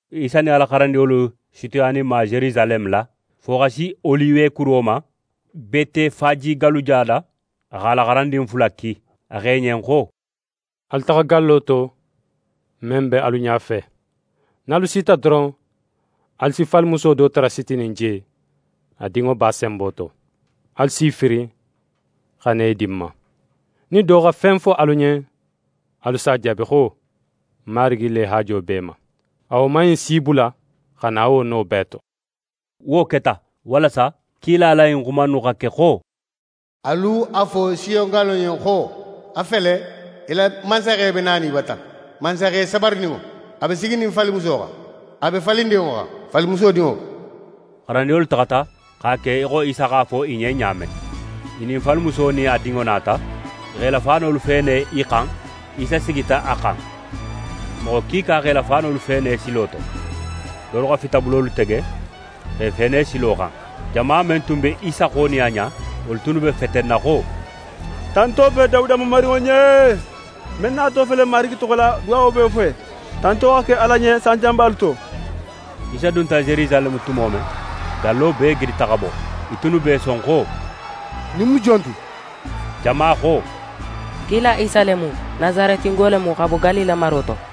Isa nin a la xarandinŋolu sutiyaninma Yerusaleme la, fo xa si Oliwe kuro ma, Betefaje galluda la, a x'a la xarandin fula ki. A xo i ɲen xo: «Alu taxa gallo to, men be alu ɲafe. Nin alu sita doron, alu si falimuso do tara sitinin je, a dinŋo b'a senbo to. Alu s'i firin, xa na i di ń ma. Nin do xa fen fo alu ɲen, alu s'a jaabi xo: “Marigi le haajo b'e ma.” A woman in si i bula xa na wo no bee to.» Wo keta, walasa kila la ɲin xuma innu xa ke xo: «Alu a fo Siyon gallo ɲen xo: “A fele, í la mansaxe be nanin í bata, mansaxe sabarininŋo, a be siginin falimuso xan, a be falindinŋo xan, falimuso dinŋo.”» Xarandinŋolu taxata x'a ke í xo Isa x'a fo i ɲen ɲa men. I nin falimuso nin a dinŋo nata, i x'e la faanolu feene i xan. Isa sigita a xan. Moxo kiika x'e la faanolu feene silo to, dolu xa fitabulolu tege x'e feene silo xan. Jama men tun be Isa xo nin a ɲa, wolu tunnu be fetenna xo: «Tanto be Dawuda Mamarinŋo ɲen! Men nato fele Marigi toxo la, duwawo be wo fe! Tanto xa ke Ala ɲen sanjanbalu to!» Isa dunta Yerusaleme tumo men, gallo bee gidita xa bo. I tunnu be i son xo: «Ɲin mu jon ti?» Jama xo: «Kila Isa le mu, Nasaretingo le mu xa bo Galile maro to.»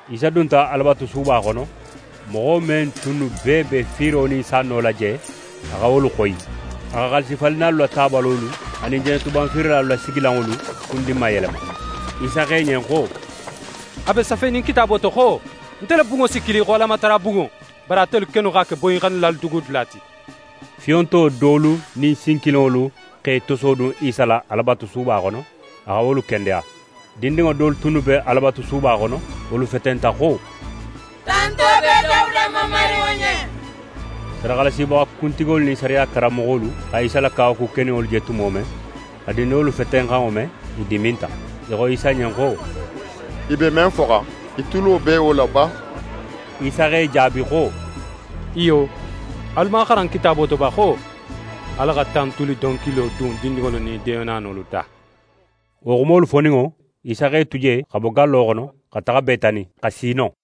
Isa dunta Alabatusuba xono. Moxo men tunnu bee be fiiro nin sanno la je, a xa wolu xoyi. A xa xaalisifalinnalu la tabalolu anin jenetuban fiirilalu la sigilanŋolu kundinmayelema. Isa xo i ɲen xo: «A be safenin Kitaabo to xo: “Nte la bunŋo si kili xo Alamatarabunŋo,” bari atelu kennu x'a ke boyinxannilalu dugudula ti.» Fiyonto dolu nin sin kilinŋolu x'e tosodun Isa la Alabatusuba xono, a xa wolu kendeya. Dindinŋo dolu tunnu be Alabatusuba xono, wolu fetenta xo: «Tanto be Dawuda Mamarinŋo ɲen!» Sadaxalasibaxa kuntigolu nin sariya karanmoxolu xa Isa la kawaku keninŋolu je tumo men, xa dindinŋolu fetenxanŋo me, i diminta. I xo Isa ɲen xo: «I be men foxan, í tulo be wo la ba?» Isa x'e jaabi xo: «Iyo, alu man a xaran Kitaabo to ba xo: “Ala xa tantuli donkilo dun dindinŋolu nin deenanolu da.”» Wo xumolu foninŋo, Isa x'e tu je xa bo gallo xono, xa taxa Betani, xa si non.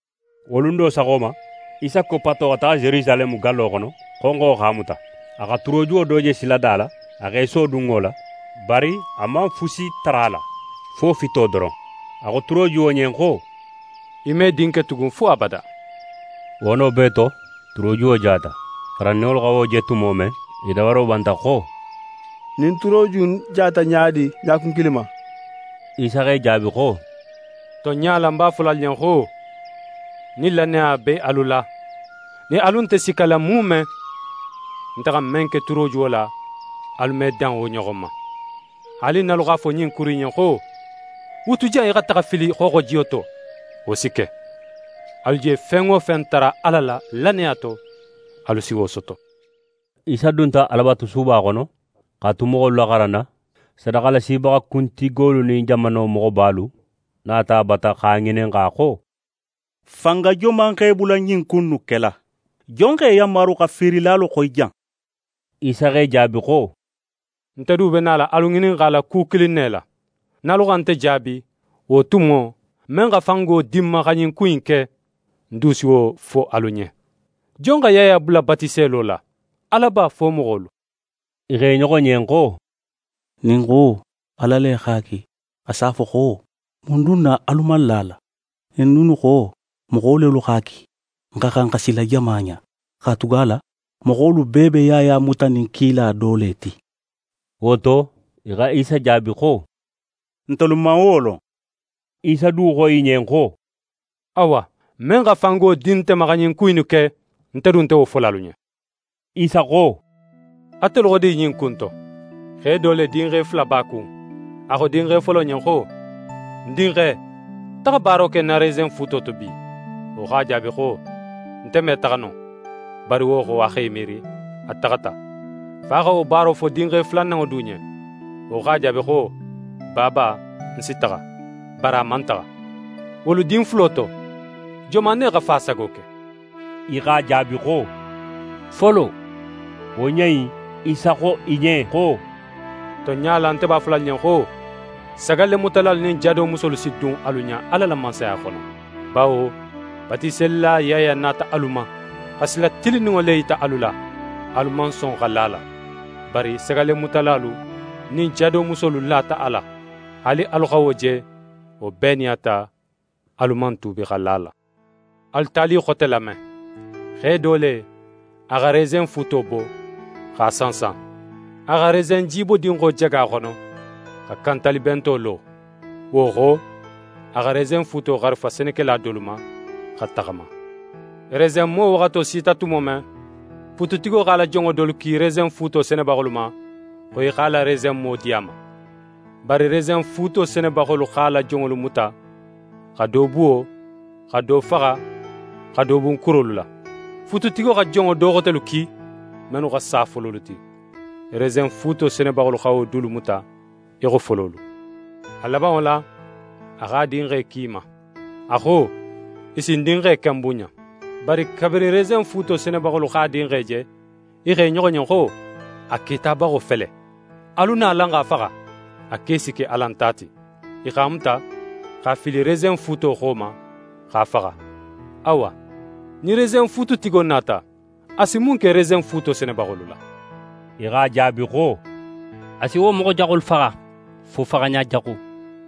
Wo lun do saxo ma, Isa koppato xa taxa Yerusaleme gallo xono, xonxo x'a muta. A xa turojuwo do je silada la, a x'é sodun wo la, bari a man fusi tara a la, fo fito doron. A xo turojuwo ɲen xo: «Í me din ke tugun fo abada!» Wo no bee to, turojuwo jata. xarandinŋolu xa wo je tumo men, i dabaro banta xo: «Ɲin turoju in jata ɲa di ɲa kun kilin ma?» Isa x'e jaabi xo: «Tonɲa la, ń b'a fola alu ɲen xo: Nin lannaya be alu la, nin alu nte sikkala muume, nte xa men ke turojuwo la, alu me dan wo ɲoxon ma. Haali nin alu x'a fo ɲin kuru in ɲen xo: “Wutu jan í xa taxa í fili xooxojiyo to,” wo si ke. Alu je fen wo fen tara Ala la, lannaya to, alu si wo soto.» Isa dunta Alabatusuba xono. X'a tu moxolu laxaranna, sadaxalasibaxa kuntigolu nin jamano moxobalu nata a bata x'a ŋininxa xo: «Fanga joman x'é bula ɲin ku innu kela? Jon x'é yanmaru xa fiirilalu xoyi jan?» Isa x'e jaabi xo: «Nte du be nala alu ŋininxala ku kilin ne la. Nin alu xa nte jaabi, wo tumo, men xa fango di ń ma xa ɲin ku innu ke, ń du si wo fo alu ɲen. Jon xa Yaya bula batiselo la, Ala ba, fo moxolu?» I xo i ɲoxo ɲen xo: «Nin n xo: “Ala le x'a ki”, a s'a fo xo: “Mun dun na alu man la a la?” Nin n dunnu xo: “Moxo lelu x'a ki”, n xa xan xa sila jama ɲa, katugala moxolu bee be Yaya mutanin kila do le ti.» Wo to, i xa Isa jaabi xo: «Ntelu man wo lon.» Isa du xo i ɲen xo: «Awa, men xa fango di nte ma xa ɲin ku innu ke, nte du nte wo fola alu ɲen.» Isa xo: «Atelu xo di ɲin ku in to? Xe do le, dinxe fula b'a kun. A xo dinxe folo ɲen xo: “Ń dinxe, taxa baaro ke ń na resenfuuto to bi.” Wo x'a jaabi xo: “Nte me taxa no.” Bari wo xo, a x'é miiri, a taxata. Fa xa wo baaro fo dinxe fulananŋo du ɲen. Wo x'a jaabi xo: “Baaba, ń si taxa.” Bari a man taxa. Wolu din fulo to, joman ne xa fa sago ke?» I x'a jaabi xo: «Folo.» Wo ɲa in, Isa xo i ɲen xo: «Tonɲa la, nte b'a fola alu ɲen xo, sagallemutalalu nin jadomusolu si dun alu ɲa Ala la Mansaya xono. Bawo Batiselila Yaya nata alu ma, xa sila tilinninŋo le yita alu la; alu man son xa la a la. Bari sagallemutalalu nin jadomusolu lata a la. Haali alu xa wo je, wo bee nin a ta, alu man tuubi xa la a la.» «Alu tali xote lame. Xe do le, a xa resenfuuto bo, x'a sansan. A xa resenjibodinxo jaga a xono, xa kantalibento lo. Wo xo, a xa resenfuuto xarifa senekela dolu ma, xa taxama. Resenmo waxato sita tumo men, fuututigo x'a la jonŋo dolu ki resenfuuto senebaxolu ma, xo i x'a la resenmo di a ma. Bari resenfuuto senebaxolu x'a la jonŋolu muta, xa do buwo, xa do faxa, xa do bun kurolu la. Fuututigo xa jonŋo do xotelu ki, mennu xa sa fololu ti. Resenfuuto senebaxolu xa wo dulu muta í xo fololu. A labanŋo la, a x'a dinxe ki i ma. A xo: “I si ń dinxe ken bunɲa.” Bari kabirin resenfuuto senebaxolu x'a dinxe je, i xo i ɲoxo ɲen xo: “A ketabaxo fele. Alu na, alan x'a faxa. A ke si ke alan ta ti.” I x'a muta x'a fili resenfuuto xo ma, x'a faxa. «Awa, nin resenfuututigo nata, a si mun ke resenfuuto senebaxolu la?» I x'a jaabi xo: «A si wo moxo jaxolu faxa, fo faxaɲa jaxu,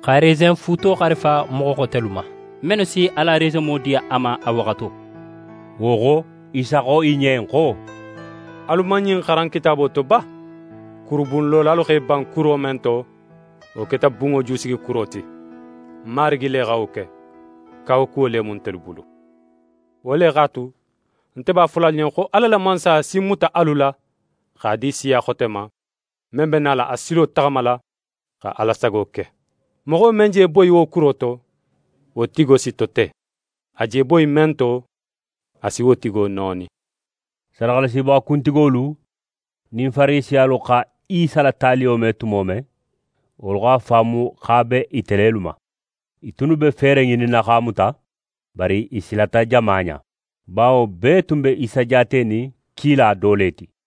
xa resenfuuto xarifa moxo xotelu ma, mennu si a la resenmo di a ma a waxato.» Wo xo, Isa xo i ɲen xo: «Alu man ɲin xaran Kitaabo to ba? “Kurubunlolalu x'e ban kuro men to, wo keta bunŋo jusigikuro ti. Marigi le xa wo ke. Kawakuwo le mu ntelu bulu!” «Wo le x'a tu, nte b'a fola alu ɲen xo Ala la Mansaya si muta alu la x'a di siya xote ma, men be nala a silo taxamala, xa Ala sago ke. [ Moxo men je boyi wo kuro to, wo tigo si tote. A je boyi men to, a si wo tigo nooni.]» Sadaxalasibaxa kuntigolu nin Farisiyalu xa Isa la taliyo me tumo men, wolu x'a faamu xo a be ite lelu ma. I tunnu be feere ŋininna x'a muta, bari i silata jama ɲa. Bawo bee tun be Isa jaatenin kila do le ti.